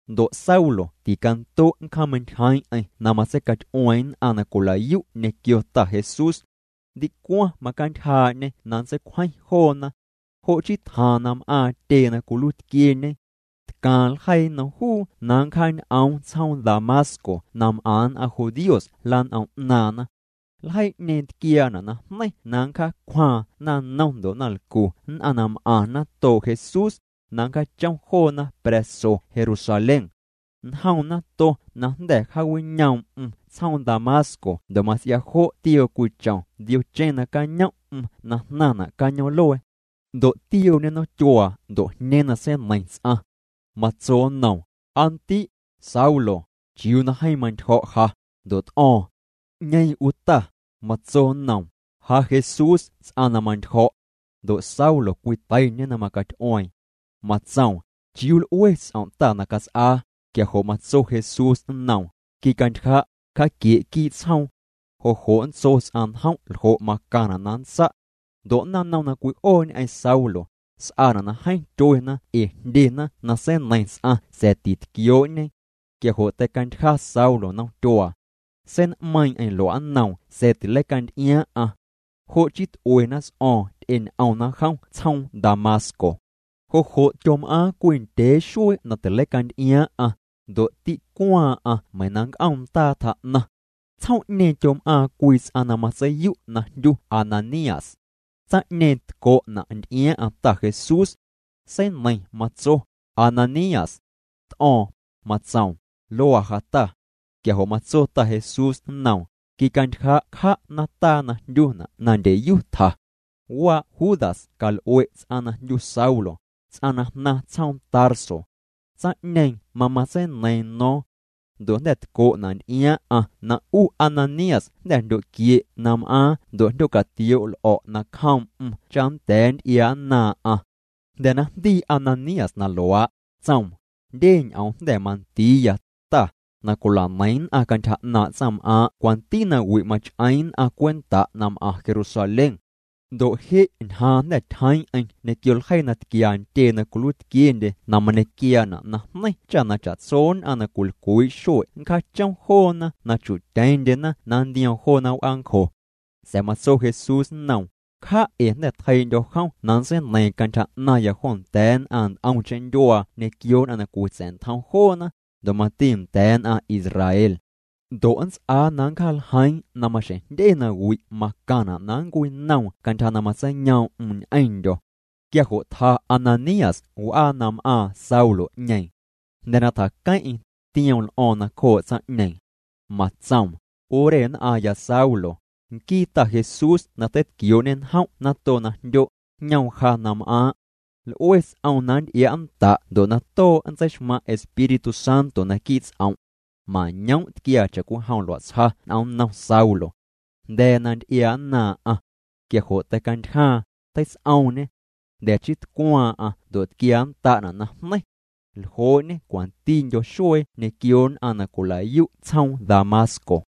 Ndo' Saulo ticando' nncjaameintyjeeⁿ'eⁿ na matseicaty'ueeⁿ nn'aⁿ na cwila'yu' ñequio Ta Jesús. Ndicwaⁿ macantyjaa'ñê na nntseicwjeⁿ joona. Jo' chii tjaaⁿ na m'aaⁿ tyee na cwiluiitquieñe. Tcaaⁿ ljeii nnom juu na nncjaañ'oom tsjoom Damasco na m'aⁿ nn'aⁿ judíos lan'om 'naaⁿna. Ljeii'ñeeⁿ tquiaana' najneiⁿ na nncjaacwjaaⁿ naⁿnom ndo' naⁿlcu nn'aⁿ na m'aⁿ natoo' Jesús, na nncjaachom joona pra̱so Jerusalén. Njoom nato na jnda̱ jaawinoom'm tsjoom Damasco ndo' mats'ia jo' tioo cwii chom ndiocheⁿ nacañom'm na jnaⁿna' cañoom'luee. Ndo' tiooñê nomtyuaa ndo' jñeeⁿ na seineiⁿ ts'aⁿ. Matso nnoom: —Aa ndi', Saulo, ¿chiuu na jeeⁿ mantyjo̱' ja? Ndo' t'o̱o̱ⁿ: —¿'Ñeeⁿ 'u Ta? Matso nnoom: —Ja Jesús ts'aⁿ na mantyjo̱'. Ndo' Saulo cwiteiñê na macaty'ueeⁿ. Matsoom: —¿Chiuu l'ue ts'om' Ta na cats'aa? Quia jo' matso Jesús nnoom: —Quicantyja', cja'quie' quii' tsjoom. Jo' jo' nntso ts'aⁿ njom' ljo' macaⁿna' na nntsa'. Ndo' naⁿnom na cwi'oo ñ'eⁿ Saulo, s'aana' na jeeⁿ tyuena ee jndyena na seineiⁿ ts'aⁿ sa̱a̱ titquioo'ñe. Quia jo' teicantyja Saulo nomtyuaa. Sein'meiiⁿ'eⁿ lua'nnoom sa̱a̱ tileicanty'iaaⁿ'aⁿ. Jo' chii t'uena ts'o̱o̱ⁿ ty'eñ'omna jom tsjoom Damasco. Jo' jo' tyom'aaⁿ cwii ndyee xuee na tileicanty'iaaⁿ'aⁿ, ndo' tîcwaaⁿ'aⁿ meiⁿ na nnc'om ndaa tjaa'naⁿ. Tsjoom'ñeeⁿ tyom'aaⁿ cwii ts'aⁿ na matseiyu' na jndyu Ananías. Tsaⁿ'ñeeⁿ tco'na' nty'iaaⁿ'aⁿ Ta Jesús. Seineiⁿ matso: —Ananías. T'o̱o̱ⁿ, matsoom: —Luaa ja Ta. Quia jo' matso Ta Jesús nnoom: —Quicantyja' cja' nataa na jndyuna' na Ndyeyu tja. Waa' Judas cal'ue' ts'aⁿ na jndyu Saulo, ts'aⁿ na jnaⁿ tsjoom Tarso. Tsaⁿ'ñeeⁿ mamatseineiiⁿ no̱o̱ⁿ. Ndo' jnda̱ tco'na' nty'iaaⁿ'aⁿ na 'u Ananías jnda̱ jndyo'quie' na m'aaⁿ ndo' jndyo'catioo' l'o̱' nacjoom'm cha nnda̱a̱ nnty'iaa'nnaaⁿ'aⁿ. Jnda̱ na jndii Ananías na luaa', tsoom: —Jndye ñ'oom jnda̱ mandiiya, Ta, na cwila'neiⁿ nn'aⁿ cantyja 'naaⁿ' tsaⁿm'aaⁿ' cwanti nawi' mach'eeⁿ nn'aⁿ cwenta' na m'aⁿ Jerusalén. Ndo' je' ñjaaⁿ jnda̱ tyjeeⁿ'eⁿ ñequio ljeii na tquia ntyee na cwiluiitquiendye na mañequiaana' najneiⁿ cha na cha'tso nn'aⁿ na cwilcwii' xue' nncjaachom joona na chu'tyeⁿndyena na nntioom joona w'aancjo. Sa̱a̱ matso Jesús nnoom: —Cja' ee jnda̱ tjeii'ndyo̱ jom na nntseineiiⁿ cantyja 'naⁿya jo nda̱a̱ nn'aⁿ nt'omcheⁿ ndyuaa ñequio nn'aⁿ na cwitsa̱'ntjom joona, ndo' mati nda̱a̱ nn'aⁿ Israel. Ndo' nnts'aa na nncjaaljeiiⁿ na maxjeⁿ jndye nawi' macaⁿna' na nncwinoom cantyja na matseiyoom'm ñ'eⁿndyo̱. Quia jo' tja Ananías w'aa na m'aaⁿ Saulo'ñeeⁿ. Jnda̱ na tjaqueⁿ'eⁿ, tioom l'o̱o̱ⁿ nacjoo' tsaⁿ'ñeeⁿ. Matsoom: —'U re nn'aⁿya Saulo, nquii Ta Jesús na teitquioo'ñê njom' nato na jndyo', jñoom ja na m'aaⁿ'. L'ue ts'oom na nnty'ia'nnda' ndo' na too' nntseixmaⁿ' Espíritu Santo naquii' ts'om'. Mañoom' tquiaa cha'cwijom lua'tsja n'om nnom Saulo. Jnda̱a̱ na nty'iaa'nnaaⁿ'aⁿ. Quia jo' teicantyjaaⁿ, teits'oomñê. Jnda̱ chii tcwaaⁿ'aⁿ ndo' tquiaannda'na' najneiⁿ. Ljoo'ñê cwantindyo xuee ñequio nn'aⁿ na cwilayu' tsjoom Damasco.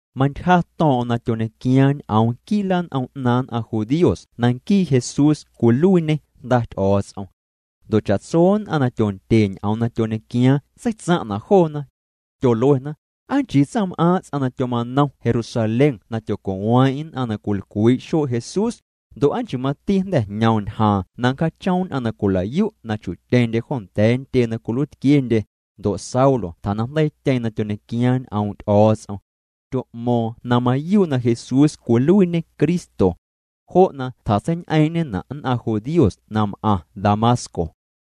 Mantyja to̱o̱ⁿ'o̱ⁿ na tyoñequiaaⁿ ñ'oom quii' lan'om 'naaⁿ nn'aⁿ judíos na nquii Jesús cwiluiiñê Jnda Ty'o̱o̱ts'om. Ndo' cha'tso nn'aⁿ na tyondye ñ'oom na tyoñequiaaⁿ seitsaⁿ'na' joona. Tyoluena: —¿Aa nchii tsaⁿm'aaⁿ' ts'aⁿ na tyoma'nom Jerusalén na tyoco'weeⁿ'eⁿ nn'aⁿ na cwilcwii' xuee' Jesús? Ndo' ¿aa nchii mati jnda̱ jñoom ñjaaⁿ na nncjaachom nn'aⁿ na cwilayu' na chu'tyeⁿndye jo nda̱a̱ ntyee na cwiluiitquiendye? Ndo' Saulo tjanaⁿjndeiityeeⁿ na tyoñequiaaⁿ ñ'oom' Ty'o̱o̱ts'om. Tyo'mo̱o̱ⁿ na mayuu' na Jesús cwiluiiñê Cristo. Jo' na tjatseiñ'eeⁿ'ñena' nn'aⁿ judíos na m'aⁿ Damasco.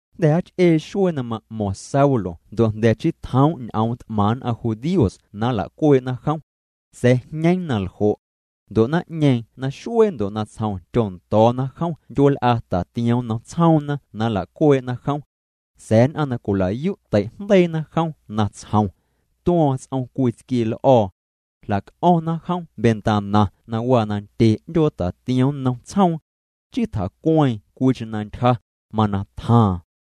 Jnda̱ jaach'ee xuee na ma'mo̱ⁿ Saulo ndo' jnda̱ chii tjoom' ñ'oom t'maⁿ nn'aⁿ judíos na nlacuee'na jom. Sa̱a̱ jñeeⁿ na ljo'. Ndo' naⁿ'ñeeⁿ naxuee ndo' natsjom tyondo̱o̱na jom ndyueel'a tatiom nnom tsjoomna na nlacuee'na jom. Sa̱a̱ nn'aⁿ na cwilayu' teijndeiina jom natsjom. Tuo̱o̱ⁿ ts'om cwii tsquiee l'o̱o̱. Jlac'o̱ⁿna jom mantana na waa na ndye 'ndyoo tatiom nnom tsjoom. Chii tjacueeⁿ cwiicheⁿ na ntyja, mana tjaaⁿ.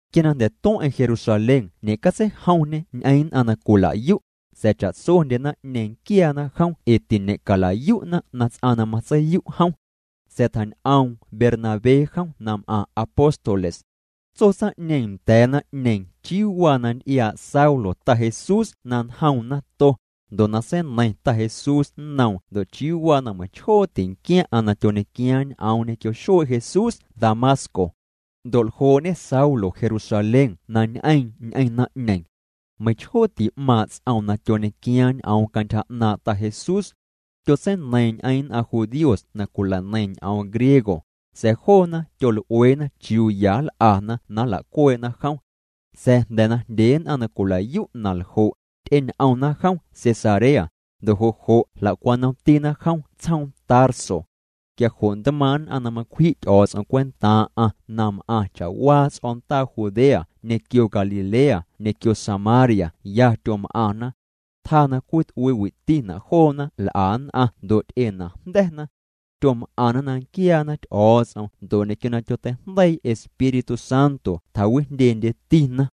Quia na jnda̱ tueⁿ'eⁿ Jerusalén ñe'catseijomñê ñ'eⁿ nn'aⁿ na cwilayu', sa̱a̱ cha'tsondye naⁿ'ñeeⁿ nquiaana jom ee tiñe'calayu'na na ts'aⁿ na matseiyu' jom. Sa̱a̱ tjañ'oom Bernabé jom na m'aⁿ apóstoles. Tso tsaⁿ'ñeeⁿ nda̱a̱ naⁿ'ñeeⁿ chiuu waa na nty'iaa' Saulo Ta Jesús na njoom nato, ndo' na seineiⁿ Ta Jesús nnoom ndo' chiuu waa na meiⁿchjoo tinquiaⁿ'aⁿ na tyoñequiaaⁿ ñ'oom ñequio xuee' Jesús Damasco. Ndo' ljoo'ñe Saulo Jerusalén na ñ'eeⁿ ñ'eⁿ naⁿ'ñeeⁿ. Meiⁿchjoo ti'maaⁿ' ts'oom na tyoñequiaaⁿ ñ'oom cantyja 'naaⁿ' Ta Jesús. Tyotseineiiⁿ ñ'eⁿ nn'aⁿ judíos na cwila'neiⁿ ñ'oom griego, sa̱a̱ joona tyol'ueena chiuu ya nl'ana na nlacuee'na jom. Sa̱a̱ jnda̱ na jndye nn'aⁿ na cwilayu' na ljo', ty'eñ'omna jom Cesarea, ndo' jo' jo' jla'cwanomtina jom tsjoom Tarso. Quia jo' ntmaaⁿ' nn'aⁿ na macwji' Ty'o̱o̱ts'om cwentaaⁿ'aⁿ na m'aⁿ cha'waa ts'o̱ndaa Judea ñequio Galilea ñequio Samaria ya tyom'aⁿna. Tjaa na cwit'uiitina' joona l'a nn'aⁿ ndo' ty'enajnda̱na. Tyom'aⁿna na nquiaana Ty'o̱o̱ts'om ndo' ñequio na tyoteijndeii Espíritu Santo tjawijndyendyetina.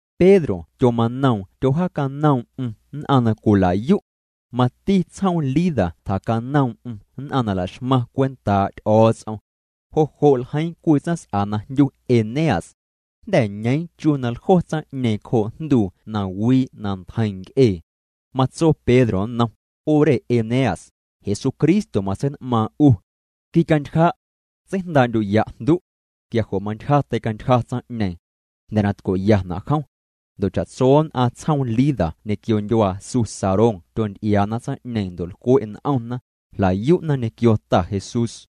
Pedro tyomanoom tyojaacanoom'm nn'aⁿ na cwilayu'. Mati tsjoom Lida tjacanoom'm nn'aⁿ na laxmaⁿ cwentaa' Ty'o̱o̱ts'om. Jo' jo' ljeiiⁿ cwii tsaⁿs'a na jndyu Eneas. Jnda̱ ñeeⁿ chu na ljo tsaⁿ'ñeeⁿ cjoo' jnduu na wii' na ntjeiⁿ nc'ee. Matso Pedro nnom: —'U re Eneas, Jesucristo matsein'maaⁿ 'u. Quicantyja'. Tseijndaa'ndyu'ya' jndu'. Quia jo' mantyja teicantyja tsaⁿ'ñeeⁿ. Jnda̱ na tco'yana' jom. Ndo' cha'tso nn'aⁿ tsjoom Lida ñequio ndyuaa su Sarón tyonty'iaana tsaⁿ'ñeeⁿ ndo' lcwe' n'omna, jlayu'na ñequio Ta Jesús.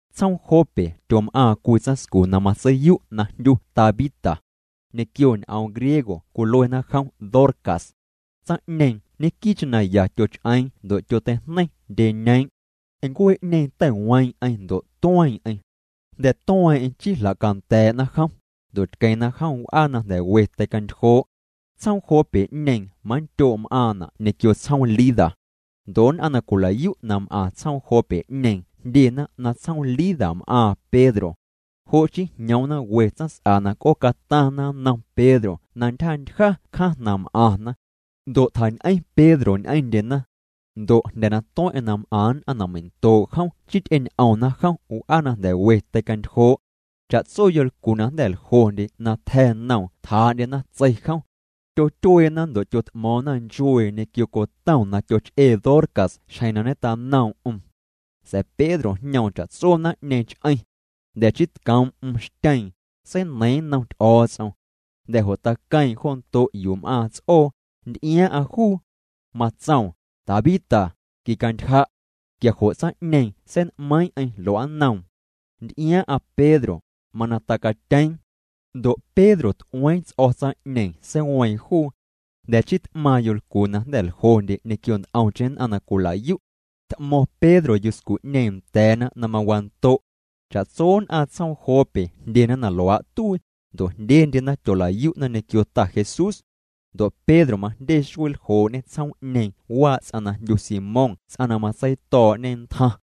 Tsjoom Jope tyom'aaⁿ cwii tsaⁿscu na matseiyu' na jndyu Tabita. Ñequio ñ'oom griego cwiluena jom Dorcas. Tsaⁿ'ñeeⁿ ñequii'cheⁿ na ya tyoch'eeⁿ ndo' tyoteijneiⁿ ndyeñeeⁿ'. Ncuee'ñeeⁿ teiweeⁿ'eⁿ ndo' tueeⁿ'eⁿ. Jnda̱ tueeⁿ'eⁿ chii jlacanda̱a̱'na jom, ndo' tqueⁿna jom w'aa na nda̱ we teicantyjoo'. Tsjoom Jope'ñeeⁿ manndyoo' m'aaⁿna' ñequio tsjoom Lida. Ndo' nn'aⁿ na cwilayu' na m'aⁿ tsjoom Jope'ñeeⁿ jndyena na tsjoom Lida m'aaⁿ Pedro. Jo' chii jñoomna we tsaⁿs'a na c'oocataⁿna nnom Pedro na ntyjantyja cjaⁿ na m'aⁿna. Ndo' tjañ'eⁿ Pedro ñ'eⁿndyena. Ndo' jnda̱ na tueⁿ'eⁿ na m'aⁿ nn'aⁿ na meindoo' jom chii ty'eñ'omna jom w'aa na jnda̱ we teicantyjoo'. Cha'tso yolcu na jnda̱ ljondye na tja̱ noom tjaa'ndyena tsei jom. Tyotyueena ndo' tyot'mo̱o̱ⁿna nchuee ñequio cotom na tyoch'ee Dorcas xjeⁿ na ñetanoom'm. Sa̱a̱ Pedro jñoom cha'tso naⁿ'ñeeⁿ ch'eⁿ. Jnda̱ chii tcoom'm xtyeeⁿ, seineiiⁿ nnom Ty'o̱o̱ts'om. Jnda̱ jo' taqueeⁿ jo ndo' yuu m'aaⁿ ts'oo, nty'iaaⁿ'aⁿ juu. Matsoom: —Tabita, quicantyja'. Quia jo' tsaⁿ'ñeeⁿ sein'meiiⁿ'eⁿ lua'nnom. Nty'iaaⁿ'aⁿ Pedro, mana tacatyeeⁿ. Ndo' Pedro t'ueeⁿ ts'o̱ tsaⁿ'ñeeⁿ seiweeⁿ juu. Jnda̱ chii t'maaⁿ yolcu na jnda̱ ljondye ñequio nt'omcheⁿ nn'aⁿ na cwilayu'. T'mo̱ⁿ Pedro yuscu'ñeeⁿ nda̱a̱na na mawando'. Cha'tso nn'aⁿ tsjoom Jope jndyena na luaa' tuii, ndo' jndyendyena tyolayu'na ñequio Ta Jesús. Ndo' Pedro majndye xuee ljoo'ñê tsjoom'ñeeⁿ waa' ts'aⁿ na jndyu Simón ts'aⁿ na matseito̱o̱'ñe ntjaⁿ.